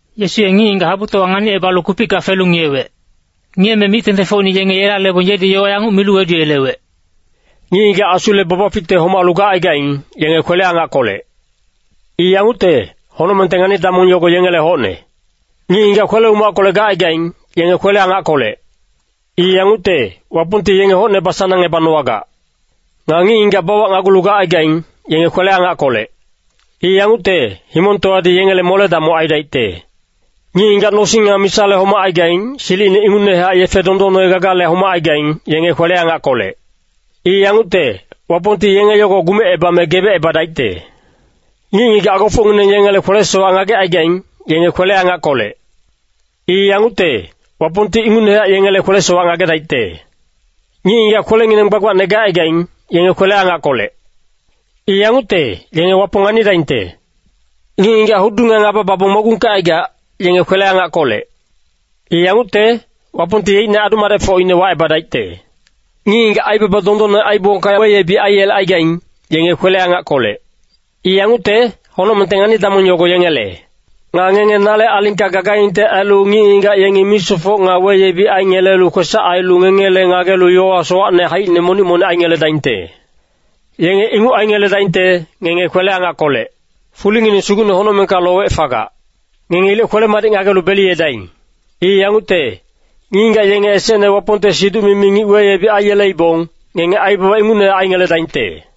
Yesu ye ngic-ngigac habutowa nganicebalu kupicka felu ngiyewec. Ngiyeme mic-tengtengfocine yenge yela lebong yedi yowa yanguc milu weduyelewec, “Ngic-ngigac asule babaficte homalu gacaigaing, yenge kwele-angackolec. I yangucte, honocmengte ngani-damong yogo yengele hocne. Ngic-ngigac kwele-umackolec gacaigaing, yenge kwele-angackolec. I yangucte, Wapongti yenge hocne basanangebanowagac. Nga ngic-ngigac bawacnagulu gacaigaing, yenge kwele-angackolec. I yangucte, himongtowadi yengele mole-damoc aidaicte. Ngic-ngigac nosing nga misale homacaigaing, silicine ingucnehac yefe dondonne gagale homacaigaing, yenge kwele-angackolec. I yangucte, Wapongti yenge yogo gumecebame gebecebadaicte. Ngic-ngigac agofocngineng yengele kwele-sowac ngagecaigaing, yenge kwele-angackolec. I yangucte, Wapongti ingucnehac yengele kwele-sowac ngagedaicte. Ngic-ngigac kwelengineng gbagbacne gacaigaing, yenge kwele-angackolec. I yangucte, yenge Wapong nganidaingte. Ngic-ngigac hudu nga ngaba babong mogungkecaigac, yenge kwele-angackolec. I yangucte, Wapongti yeicne adu-madecfocine wacebadaicte. Ngic-ngigac aibaba dondonne aiyebongka weyebic aiyelecaigaing, yenge kwele-angackolec. I yangucte, honocmengte ngani-damong yogo yengele. “Nga ngenge nale alingka gagaingte ailu ngic-ngigac yengi misofoc nga weyebic aingelelu kwesac ailu ngengele ngagelu yowa sowacne haicine monic-monic aingeledaingte. Yenge inguc aingeledaingte, ngenge kwele-angackolec. Fulingineng sugucne honocmengka lowec fagac. Ngenge ilec kwele-madic ngagelu beliyedaing. I yangucte, ngic-ngigac yenge esecne Wapongte siduc-mimi ngic weyebic aiyeleibong, ngenge aibaba ingucnehac aingeledaingte.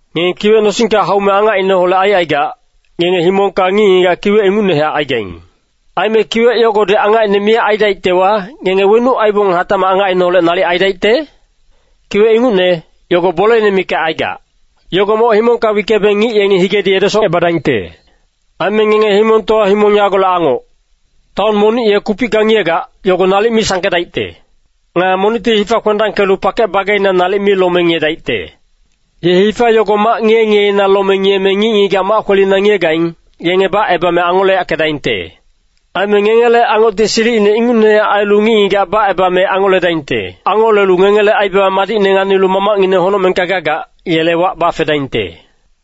“Ngenge kiwec nosingka haume angacineholec aicaigac, ngenge himongka ngic-ngigac kiwec ingucnehac aigaing. Aime kiwec yogodi angacine miyac aidaictewa, ngenge wenuc aibong hatacmac angacineholec nalic aidaicte? Kiwec ingucne, yogo boleine mikac aigac. Yogo moc himongka wickebeng ngic yengi higedi edesocebadaingte. “Aime ngenge himongtowa himong yagolec angoc. Taon monic ye kupicka ngiyegac, yogo nalic mi sangkedaicte. Nga monicti hifa kwendangkelu pakec bageina nalic mi lome ngiyedaicte. Ye hifa yogo mac ngiye-ngiyeina lome ngiyeme ngic-ngigac mac kwelina ngiyegaing, yenge bacebame angoleyackedaingte. Aime ngengele angocti silicine ingucnehac ailu ngic-ngigac bacebame angoledaingte. Angolelu ngengele aibaba madicne nganilu Mamacngineng honocmengka gagac, yele wac bafedaingte.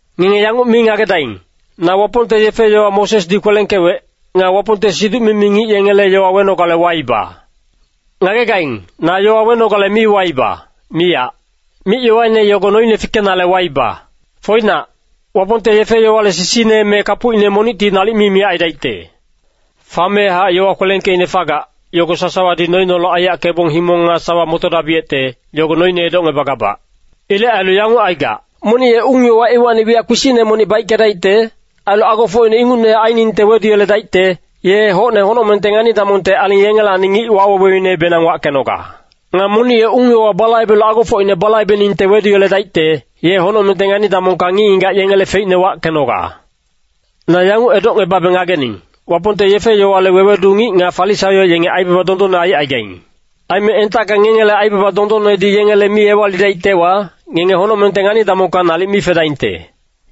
“Ngenge yanguc mi ngagedaing, na Wapongte yefe-yowa Mosesdi kwelengkewec, nga Wapongte siduc-mimi ngic yengele yowa wenogale waiba. Ngagegaing, na yowa wenogale mi waiba, miyac. Mic-yowaine yogo noine fikenale waiba. Foinac, Wapongte yefe-yowale sisine me kapucine monicti nalic mi miyac aidaicte. Famehac yowa kwelengkeicne fagac, yogo sasawadi noineholec aiyackebong himong nga sawa motodabiyecte, yogo noine edocngebagabac. Ilec ailu yanguc aigac. Monic ye ung-yowa iwacni wiyac kpisicne monic baickedaicte, ailu agofocine ingucnehac ainingte weduyeledaicte, ye hocne honocmengte ngani-damongte aling yengelacni ngic waweweinebenang wackenoga. Nga monic ye ung-yowa balaibelu agofocine balaibeningte weduyeledaicte, ye honocmengte ngani-damongka ngic-ngigac yengele feicne wackenoga. Na yanguc edocngebabe ngagening, Wapongte yefe-yowale wewedu ngic nga Farisaio yenge aibaba dondonne aicaigaing. Aime entacka ngengele aibaba dondonnedi yengele mi ewalidaictewa, ngenge honocmengte ngani-damongka nalic mi fedaingte.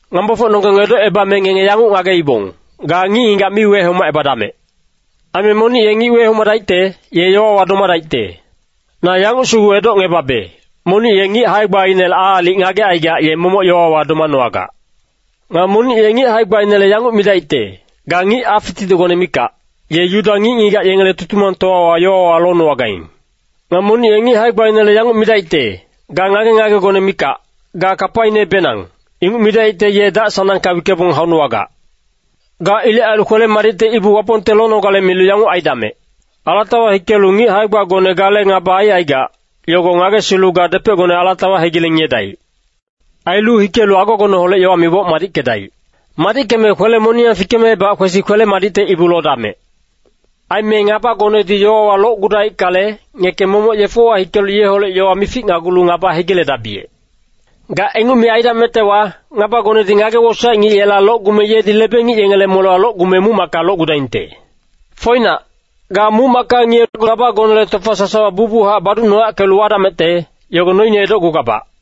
“Ngampafocnonggeng edocebame ngenge yanguc ngageibong, ‘Ga ngic-ngigac mi wehomacebadamec.’ Aime ‘monic ye ngic wehomadaicte, ye yowawa domadaicte.’ Na yanguc sugu edocngebabe, monic ye ngic hae-gbainele aalic ngagecaigac ye momoc yowawa domanowagac. Nga monic ye ngic hae-gbainele yanguc midaicte, ‘Ga ngic acfititicgone mikac,’ ye Yuda ngic-ngigac yengele Tutumangtowawa yowawa lonowagaing. Nga monic ye ngic hae-gbainele yanguc midaicte, ‘Ga ngage-ngagegone mikac, ga kapainebenang,’ inguc midaicte ye dac-sanangka wickebong haunowagac. “Ga ilec ailu kwele-madicte ibu Wapongte lonogale milu yanguc aidamec. Alatawa hikelu ngic hae-gbagone gale ngaba aicaigac, yogo ngagesilu ga depecgone alatawa hegileng ngiyedaic. Ailu hikelu agogoneholec yowa miboc madickedaic. Madickeme kwele-moniyang fikemebac kwesi kwele-madicte ibu lodamec. “Aime ngabagonedi yowawa locgudaickale, ngeke momoc yefewa hikelu yeholec yowa mificnagulu ngaba hegiledabiyec. Ga inguc mi aidamectewa, ngabagonedi ngage-wosaec ngic yela locgume yedi lebe-ngic yengele molewa locgume muc-macka locgudaingte. Foinac, ga muc-macka ngiyecgu ngabagonele tofa sasawa bucbuchac baducnoyackelu wadamecte, yogo noine edocgugabac.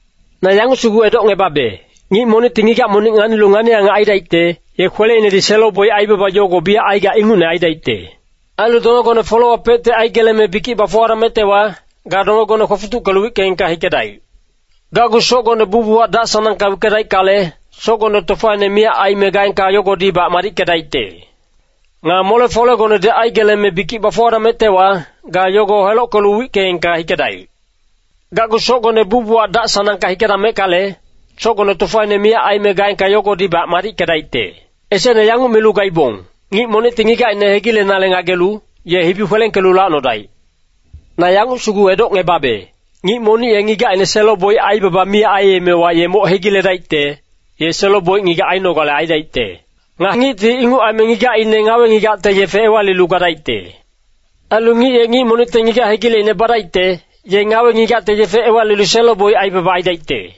Na yanguc sugu edocngebabe, ngic monicti ngigac monic nganilu ngani-angac aidaicte, ye kweleinedi selo-boic aibaba yogo biyac aigac ingucne aidaicte. Ailu dongegone folewapecti aigeleme bikic bafuwadamectewa, ga dongegone kwofutuckelu wickeengka hikedaic. Gacgu socgone bucbuchac dac-sanangka wickedaickale, socgone tofaine miyac aime gaengka yogodibac madickedaicte. Nga mole-folegonedi aigeleme bikic bafuwadamectewa, ga yogo helockelu wickeengka hikedaic. Gacgu socgone bucbuchac dac-sanangka hikedameckale, socgone tofaine miyac aime gaengka yogodibac madickedaicte. “Esecne yanguc milu gaibong, ‘Ngic monicti ngigacine hegilenale ngagelu, ye hibi kwelengkelu lacnodaic.’ Na yanguc sugu edocngebabe, ngic monic ye ngigacine selo-boic aibaba mi aiyemewa ye moc hegiledaicte, ye selo-boic ngigac ainogale aidaicte. Nga ngicti inguc aime ngigacine ngawe-ngigacte yefe ewalilu gadaicte. Ailu ngic ye ngic monicte ngigac hegileicne badaicte, ye ngawe-ngigacte yefe ewalilu selo-boic aibaba aidaicte.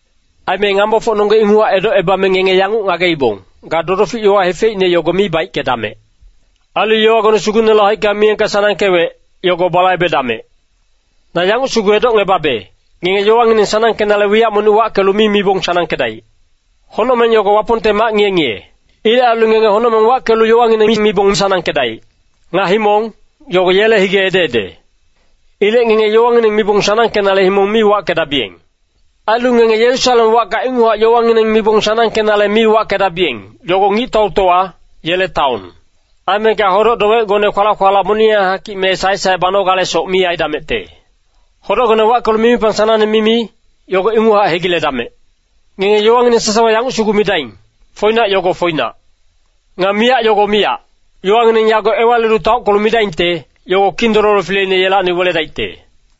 “Aime ngampafocnonggeng inguchac edocebame ngenge yanguc ngageibong, ‘Ga dodofic yowa hefeicne yogo mi baickedamec. Ailu yowagone Sugucnele haicka miyengka sanangkewec, yogo balaibedamec.’ Na yanguc sugu edocngebabe, ngenge yowangineng sanangkenale wiyac monic wackelu mi mibong sanangkedaic. Honocmeng yogo Wapongte mac ngiye-ngiye. Ilec ailu ngenge honocmeng wackelu yowangineng mi mibong sanangkedaic. Nga himong, yogo yele hige ede-ede. Ilec ngenge yowangineng mibong sanangkenale himong mi wackedabiyeng. Ailu ngenge Yerusalem wacka inguchac yowangineng mibong sanangkenale mi wackedabiyeng, yogo Ngictautowa, yele taon. Aime ga hodoc-dowecgone kwalac-kwalac moniyang hakic me saec-saec banogalesoc mi aidamecte. Hodocgone wackelu mimipang sanangne mimi, yogo inguchac hegiledamec. Ngenge yowangineng sasawa yanguc sugu midaing, ‘Foinac’ yogo foinac. Nga ‘miyac’ yogo miyac. Yowangineng yago ewalilu taockelu midaingte, yogo Kindololo fileine yelacni weledaicte.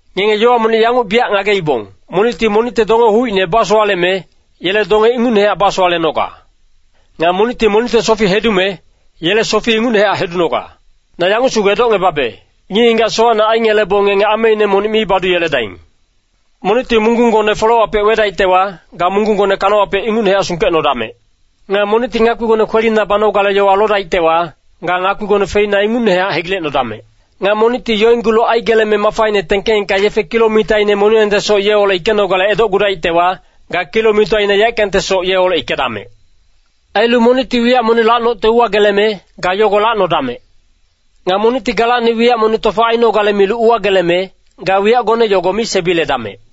“Ngenge yowa monic yanguc biyac ngageibong, ‘Monicti monicte donge hucine basowaleme, yele donge ingucnehac basowalenoga. Nga monicti monicte sofi hedume, yele sofi ingucnehac hedunoga.’ Na yanguc sugu edocngebabe, ngic-ngigac sowacne aingelebong ngenge ameine monic mi baduyeledaing. Monicti munggunggone folewapec wedaictewa, ga munggunggone kanawapec ingucnehac sungkecnodamec. Nga monicti ngakpigone kwelina banogale yowa lodaictewa, ga ngakpigone feina ingucnehac hegilecnodamec. Nga monicti yoinggulu aigeleme mafaine tengkeengka yefe kilomitaine moniyangtesoc yeholec hikenogale edocgudaictewa, ga kilomitaine yaeckangtesoc yeholec hikedamec. Ailu monicti wiyac monic lacnocte uwageleme, ga yogo lacnodamec. Nga monicti galacni wiyac monic tofa ainogale milu uwageleme, ga wiyacgone yogo mi sebiledamec.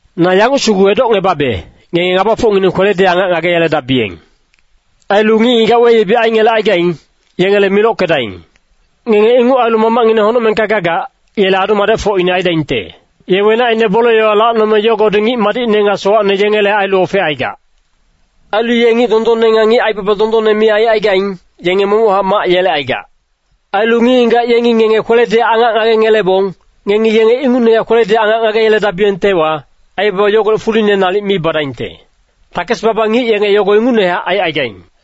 Na yanguc sugu edocngebabe, ngenge ngabafocngineng kweledi angac ngageyeledabiyeng. Ailu ngic-ngigac weyebic aingelecaigaing, yengele milockedaing. Ngenge inguc ailu Mamacngineng honocmengka gagac, yele adu-madecfocine aidaingte. Ye wenacine bole-yowa lacnome yogodi ngic madicne nga sowacne yengele ailu ofecaigac. Ailu ye ngic dondonne nga ngic aibaba dondonne mi aicaigaing, yenge momochac mac yelecaigac. Ailu ngic-ngigac yengi ngenge kweledi angac ngagengelebong, ngengi yenge ingucnehac kweledi angac ngageyeledabiyengtewa, aibaba yogolec fuline nalic mi badaingte. Takes-baba ngic yenge yogo ingucnehac aicaigaing.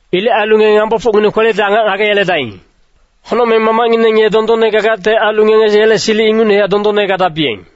Ilec ailu ngenge ngabafocngineng kweledi angac ngageyeledaing. Honocmeng Mamacngineng ye dondonne gagacte ailu ngenge yele silic ingucnehac dondonne gadabiyeng.”